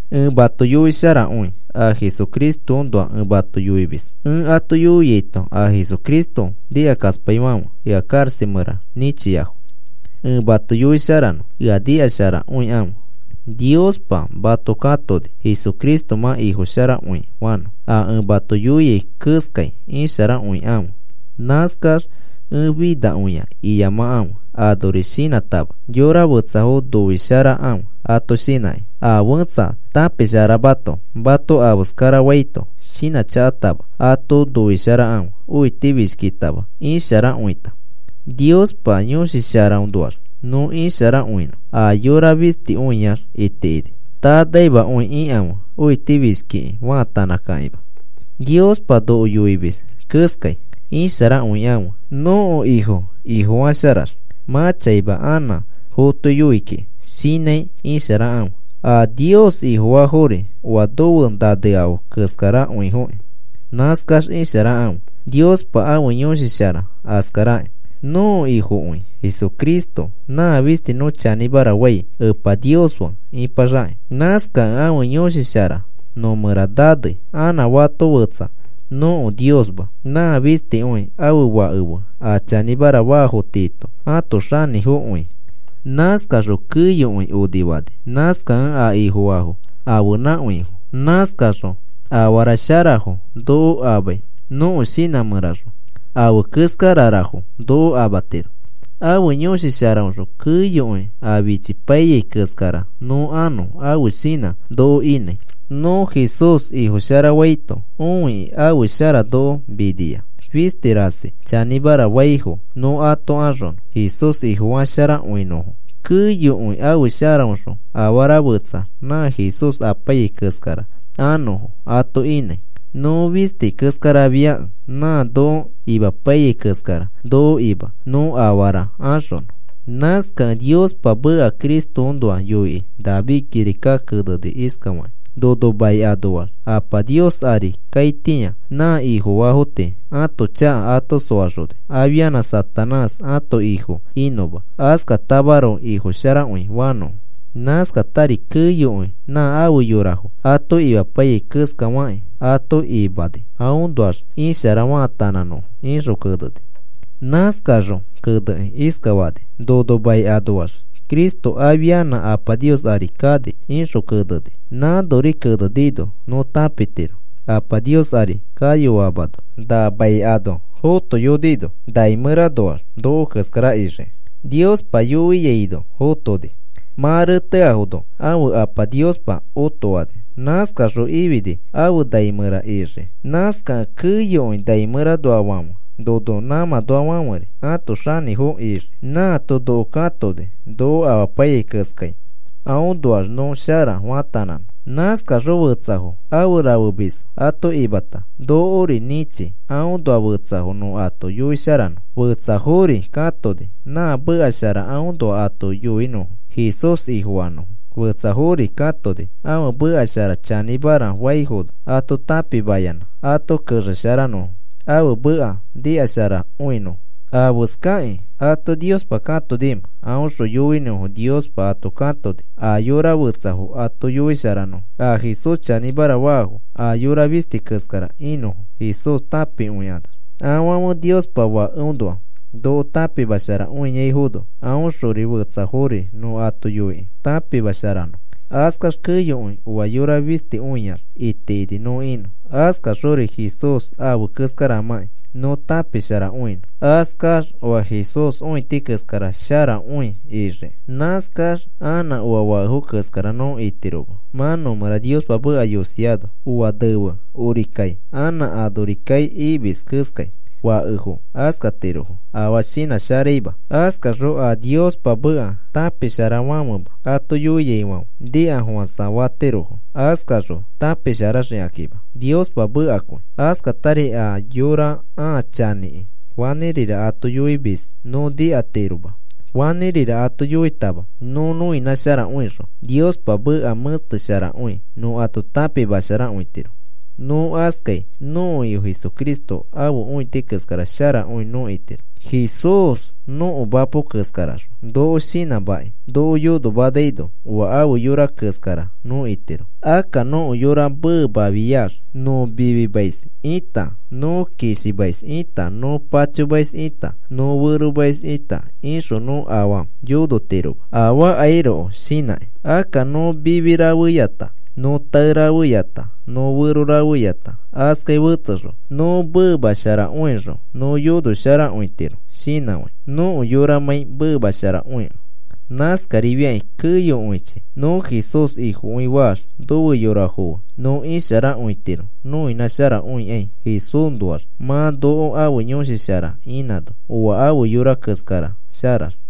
Ẽ mato yoisharakõi. A Jesucristoõnoa ẽ mato yoimis. Ẽ ato yoiaito a Jesucristo nikakaspaifãfe ea karaxa mẽra nĩchiafo. Ẽ mato yoisharanõ, ea nikasharakõikãfe. Niospa mato katoni Jesucristo mã Ifosharakõi fanõ. A ẽ mato yoiai keskai isharakõikãfe. Nãskax, “Ẽ finakõia,” iyamakãfe, anori shinãtama. Yora fetsafo noisharakãfe ato shinãkĩ. A fẽtsa tãpisharamato mato afeskarafaito, shinãchakatama ato noisharakãfe, õitifishkitama, isharakõita. Niospa Yõshi Sharaõnoax nõ isharakõinõ a yora fistikõiax itikini. Tanaimakõi ikãfe, õitifishkiki faatanãkakĩma. Niospa noko yoimis keskai: “Isharakõikãfe, nõko Ifo ifofasharax, mã chaima anã fotoiyoi kiki,” shinãi isharakãfe. A Nios Ifofaafori oa nofe naneafo keskarakõifoki. Nãskax isharakãfe. Niospa ãfe Yõshi Shara askarakĩ. Nõko Ifokõi Jesucristo. Nã fisti nõ chanĩmara fai Epa Nios fe ĩpaxakĩ. Nãskakẽ ãfe Yõshi Shara nõ mẽra nanei. Anã fato fetsa nõko Niosma. Nã fistikõi ãfe Fake fe a chanĩmara faafo tiito ãto xanĩfokõi. Nãskaxõ keyokõi onifani. Nãskakẽ a Ifofaafo ãfenãkõifo. Nãskaxõ afara sharafo noko amai nõko shinã mẽraxõ afe keskararafo noko amatiro. Ãfe Yõshi Sharaõxõ keyokõi a fichipaiyai keskara nõ anõ ãfe shinã noko inãi. Nõ Jesús Ifo sharafaito õikĩ ãfe shara noko minia fisti rasi chanĩmara faifo nõ ato axonõ Jesús Ifofasharakõinõfo. Keyokõi ãfe sharaõxõ afara fetsa nã Jesús apaiyai keskara anõfo ato inãi. Nõ fisti keskarafiakẽ nã noko imapaiyai keskara noko ima nõ afara axonõ. Nãskakẽ Niospa meka Cristoõnoa yoikĩ David kirika kenekĩ iskafani: Nono mai anoax Apa Nios ari kaitĩa nã Ifofaafo tii ãto chaka ato soaxoni afianã Satanás ãto ifo inõma, askatamaroko Ifo sharakõi fanõfo. Nãskatari keyokõi nã afe yorafo ato imapaiyai keska fakĩ ato imani aõnoax ishara faatanãnõfo, ixõ keneni. Nãskaxõ kenekĩ iskafani: “Nono mai anoax Cristo afianã Apa Nios ari kani,” ixõ keneni. Nãnori kenenino nõ tãpitiro Apa Nios ari kayoamano na mai ano fotoyonino nai mẽranoax noko keskara ixiki. Niospa yoiaino, fotoni. Mã reteafono ãfe Apa Niospa otoani. Nãskaxõ ifini afe nai mẽra ixii. Nãskakẽ keyokõi nai mẽranoafofãfe nono nãmãnoafãferi ãto xanĩfo ixii. Nãato noko katoni noko imapaiyai keskai aõnoax nõ shara faatanãnõ. Nãskaxõ fetsafo afe rafemisfo ato imata, nokori nĩchi aõnoa fetsafo nõ ato yoisharanõ. Fetsafori katoni nã meka shara aõnoa ato yoinõfo Jesús Ifofanõfo. Fetsafori katoni ãfe meka shara chanĩmara faifono ato tãpimayanã ato kexesharanõfo ãfe meka nikasharakõinõfo. ¿Afeskakĩ ato Niospa katonimẽ? Aõxõ yoinõfo Niospa ato katoni a yora fetsafo ato yoisharanõfo, a Jesús chanĩmara faafo aa yora fisti keskara inõfo Jesús tãpikõikanax. Afãfe Niospa Fakeõnoa noko tãpimasharakõiaifono, aõxori fetsafori nõ ato yoikĩ tãpimasharanõ. Askax keyokõi oa yora fistikõiax itikini nõ inõ. Askaxori Jesús afe keskaramãki nõ tãpisharakõinõ. Askax oa Jesús õiti keskara sharakõi ixiki. Nãskax anã oa fakefo keskara nõ itiroma mã nõmẽra Niospa meka yosiano. Oa nefe onori kai, anã onori kai imis keskai, fakefo askatirofo afaa shinãsharaima. Askaxõ a Niospa meka tãpisharafãfema ato yoiaifãfe nikafofãsa fatirofo. Askaxõ tãpisharaxikakĩma Niospa mekakõi. Askatari a yora ãa chanĩki fanĩrira ato yoimis nõ nikatiroma. Fanĩrira ato yoitama nõ nõinãsharakõixõ Niospa meka mẽstesharakõi nõ ato tãpimasharakõitiro. Nõ askai nõko Ifo Jesucristo ãfe õiti keskara sharakõi nõ itiro. Jesús nõko mapo keskaraxõ noko shinãmakĩ noko yonomanaino, oa afe yora keskara nõ itiro. Akka nõko yora meemafiax nõ mifimais ita, nõ kishimais ita, nõ pachomais ita, nõ feromais ita, ixõ nõ afaa yonotiroma, afaakairoko shinãkĩ. Akka nõ mifi rafeyata, nõ tae rafeyata, nõ fero rafeyata, askai fetsexõ nõ meemasharakõixõ nõ yonosharakõitiro shinãfãi, nõko yoramãi meemasharakõikẽ. Nãskafakĩri keyokõichi nõ Jesús Ifokõi faax nofe yorafo fe nõ isharakõitiro noinãsharakõikai, Jesúsnoax mã noko ãfe Yõshi Shara inãno oa ãfe yora keskara sharax.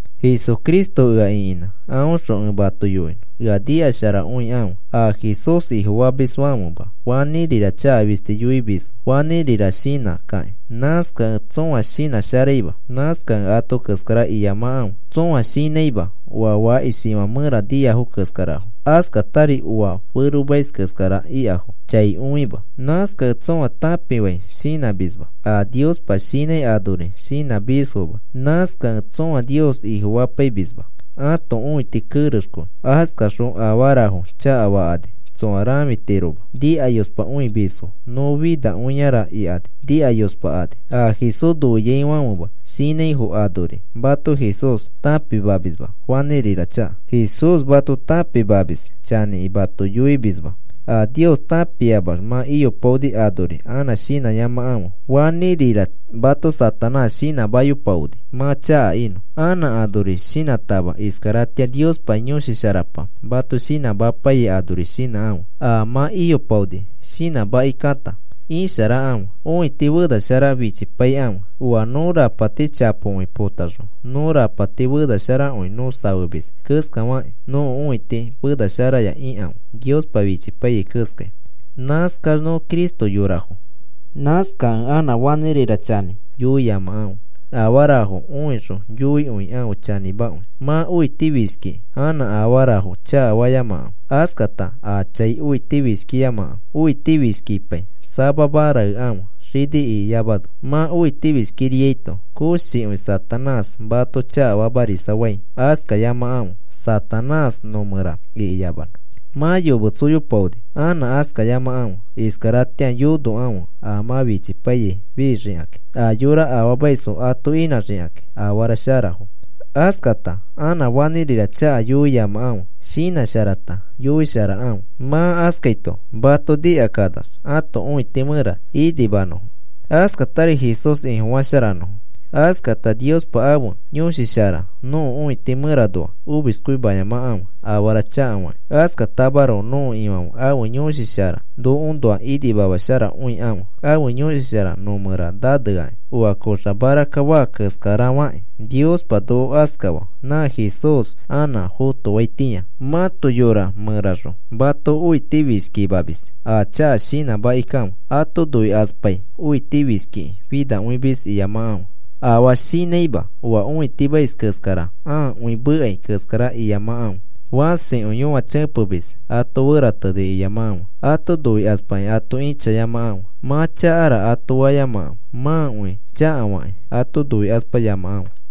Jesucristo ea ĩkinã aõxõ ẽ mato yoinõ. Ea nikasharakõikãfe a Jesús Ifofamisfãfema fanĩrira chaka fisti yoimisfo fanĩrira shinã kakĩ. Nãskakẽ tsõa shinãsharaima. Nãskakẽ ato keskara iyamakãfe. Tsõa shinãima oa fakishifã mẽra niafo keskarafo. Askatari oa feromais keskara ikafo chai õima. Nãskakẽ tsõa tãpifãi shinãmisma. A Niospa shinãi anori shinãmisfoma. Nãskakẽ tsõa Nios Ifofapaimisma. Ãto õiti kerexkõi. Askakaxõ afarafo chakafakani tsoa rãfitiroma. Nikayospakõimisfo, nõ finakõiara ikani nikayospakani. A Jesús noiaifãfema shinãifo anori mato Jesús tãpimamisma fanĩrira chaka. Jesús mato tãpimamis chanĩkĩ mato yoimisma. A Nios tãpiamax mã iyopaoni anori anã shinãyamakãfe. Fanĩrira mato Satanás shinãmayopaoni mã chaka inõ. Anã anori shinãtama, iskaratĩa Niospa Yõshi Sharapa mato shinãmapaiyai anori shinãkãfe a mã iyopaoni shinãmakikãta, isharakãfe. Õiti fenashara fichipaikãfe. Oa nõ rapati chapokõi potaxõ nõ rapati fenasharakõi nõ safemis keskafakĩ, õiti fena sharaya ikãfe Niospa fichipaiyai keskai. Nãskax nõ Cristo yorafo. Nãskakẽ anã fanĩrira chanĩ yoiyamakãfe. Afara õixõ yoikõikãfe chanĩmakõi. Mã õitifishkikĩ anã afarafo chakafayamakãfe. Askata aa chai õitifishkiyamakãfe. Õitifishkipai samama raekãfe xini ikiyamano. Mã õitifishkiriaito koshikõi Satanás mato chakafamarisafai. Askayamakãfe Satanás nõ mẽra ikiyamanõ. Mã yometsoyopaoni anã askayamakãfe. Iskaratĩa yonokãfe a mã fichipaiyai fixikakĩ, a yora afaamaisfo ato inãxikakĩ afara sharafo. Askata anã fanĩrira chaka yoiyamakãfe. Shinãsharata yoisharakãfe. Mã askaito mato nikakanax ãto õiti mẽra inimanõfo. Askatari Jesús Ifofasharanõfo. Askata Niospa ãfe Yõshi Shara nõko õiti mẽranoa omiskõimayamakãfe afara chakafakĩ. Askatamaroko nõko Ifãfe ãfe Yõshi Shara nokoõnoa inimamasharakõikãfe. Ãfe Yõshi Shara nõ mẽra naneakĩ, oa koxa marakka faa keskarafakĩ Niospa noko askafaa nã Jesús anã fotoaitĩa. Mãto yora mẽraxõ mato õiti fishkimamis a chaka shinãmakikãfe. Ato noikaspai õitifishkikĩ finakõimis iyamakãfe. Afaa shinãima oa õitimais keskara ãakõi mekai keskara iyamakãfe. Fãsikõi yõachepemis ato ferateni iyamakãfe. Ato noikaspakĩ ato ĩchayamakãfe. Mã chakara ato fayamakãfe. Mãkõi chakafakĩ ato noikaspayamakãfe.